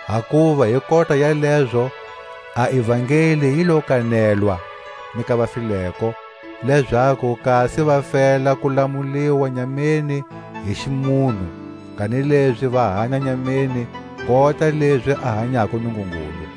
Hakuva hi kota ya lezo a ivangeli yi lo kanelwa ni ka vafileko, lezaku kasi va fela ku lamuliwa nyameni hi ximunhu, kanilezi va hanya nyameni kota lezi a hanyako Nungungulu.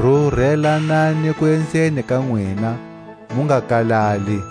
Rurelanani kuenzeni ka nwina, mu nga kalali.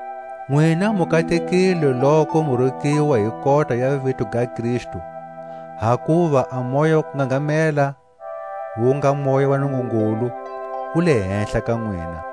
Nwina mu katekile loku mu rukiwa hi kota ya vito ga Kristu; hakuva a Moya wa kungangamela, wu nga Moya wa Nungungulu, wu le hehla ka nwina.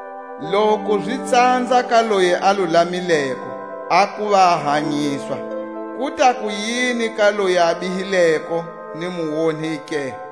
Loku zi tsanza ka loyi a lulamileko a kuva a hanyiswa, ku ta kuyini ka loyi a bihileko ni muonhi ke?